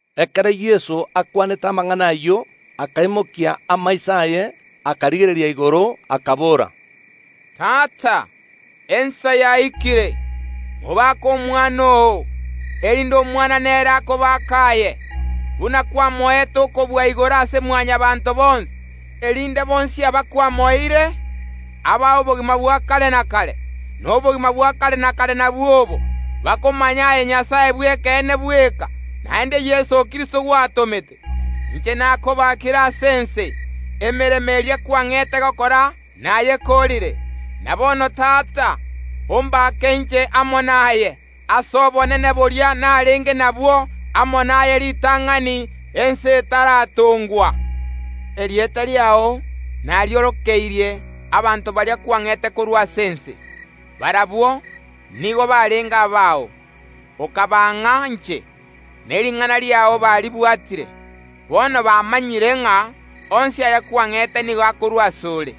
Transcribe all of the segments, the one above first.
Ekero Yeso akwanete amang’ana ayio akaimokia amaiso aye, akarigereria igoro, akabora, “Tata, ensa yaikire. Mobake Omwana oo, erinde Omwana nere akobake aye, buna kwamoete okobua igoro ase Mwanyabaanto bonsi, erinde bonsi aba kwamoeire, abae obogima bwa kare na kare. Na obogima bwa kare na kare nabwo obo: bakomanye aye Nyasae bw’ekeene bweka, naende Yeso Kristo gwatomete. Inche nakobakire ase ense, emeremo eria kwang’ete gokora nayekoorire. Na bono Tata, ombake inche amo naye, ase obonene boria narenge nabwo amo naye ritang’ani ense etaratongwa. “Erieta riao nariorokeirie abanto baria kwang’ete korwa ase ense. Barabwo nigo barenge abao, okabang’a inche, ne ring’ana riao baribwatire. Bono bamanyire ng’a onsi aya kwang’ete nigo akorwa ase ore.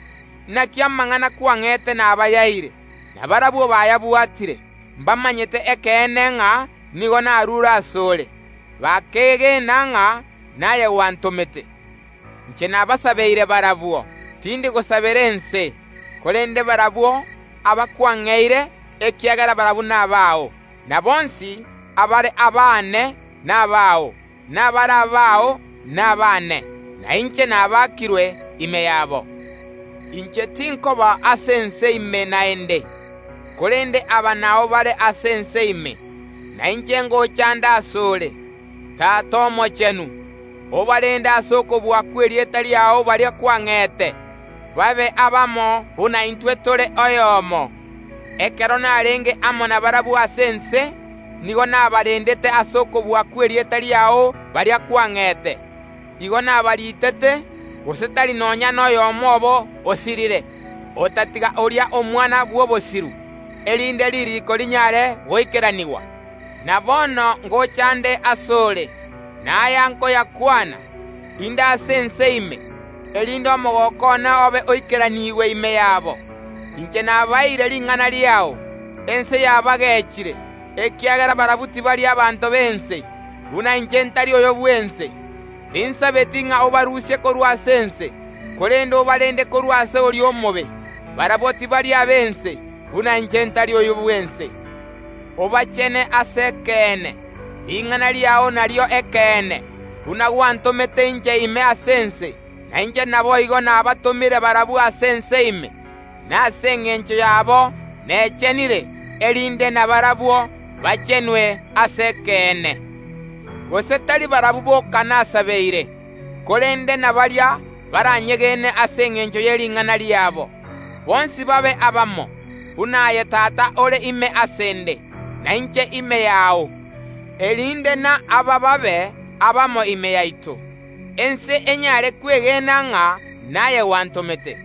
Naki amang’ana kwang’ete nabayaeire, na barabwo bayabwatire, mbamanyete ekeene ng’a nigo narure ase ore, bakeegena ng’a naye gwantomete. Inche nabasabeire barabwo; tindi gosabera ense, korende barabwo aba kwang’eire ekiagera barabwo nabao. Na bonsi abare abaane nabao, na abare abao nabaane, na inche nabakirwe ime yabo. Inche tinkoba ase ense ime naende, korende aba nao bare ase ense ime, na inche ngocha nde ase ore. Tata Omochenu, obarende ase okobua kw’erieta riao baria kwang’ete, babe abamo buna intwe tore oyomo. Ekero narenge amo nabarabwo ase ense, nigo nabarendete ase okobua kw’erieta riao baria kwang’ete. Igo nabaritete, gose tari nonya noyomo obo osirire, otatiga oria omwana bw’obosiru, erinde ririiko rinyare goikeranigwa. Na bono ngocha nde ase ore, na aya nkoyakwana, inde ase ense ime, erinde omogooko one obe oikeranigwe ime yabo. Inche nabaeire ring’ana riao; ense yabagechire, ekiagera barabwo tibari abanto b’ense, buna inche ntari oyo bw’ense. Tinsabeti ng’a obarusie korwa ase ense, korende obarende korwa ase oria omobe. Barabwo tibari ab’ense, buna inche ntari oyo bw’ense. Obachene ase ekeene; ring’ana riao nario ekeene. Buna gwantomete inche ime ase ense, na inche naboigo nabatomire barabwo ase ense ime. Na ase engencho yabo nechenire, erinde nabarabwo bachenwe ase ekeene. “Gose tari barabwo boka nasabeire, korende na baria baranyegene ase engencho ye ring’ana riabo, bonsi babe abamo, buna aye Tata ore ime ase ’nde, na inche ime yao, erinde na aba babe abamo ime yaito; ense enyare kwengena ng’a naye gwantomete.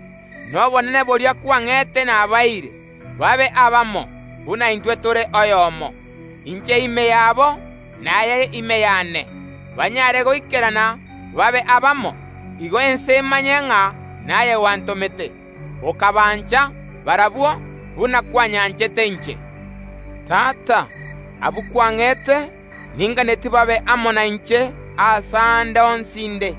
Na obonene boria kwang’ete nabaeire, babe abamo, buna intwe tore oyomo; inche ime yabo, na aye ime yane, banyare goikerana babe abamo. Igo ense emanye ng’a naye gwantomete, okabancha barabwo, buna kwanyanchete inche. Tata, abwo kwang’ete, ninganetie babe amo nainche aase aande onsi inde,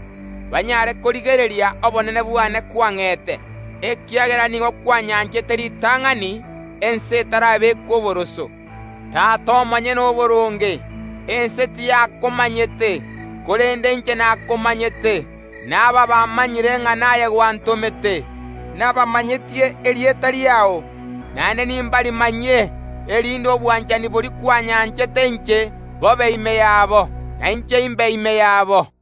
banyare korigereria obonene bwane kwang’ete, ekiagera nigo kwanyanchete ritang’ani ense etarabekwa oboroso. Tata omonyene oboronge, ense tiyakomanyete, korende inche nakomanyete; na aba bamanyire ng’a naye gwantomete. Nabamanyetie erieta riao, naende nimbarimanyie, erinde obwanchani boria kwanyanchete inche bobe ime yabo, na inche imbe ime yabo.”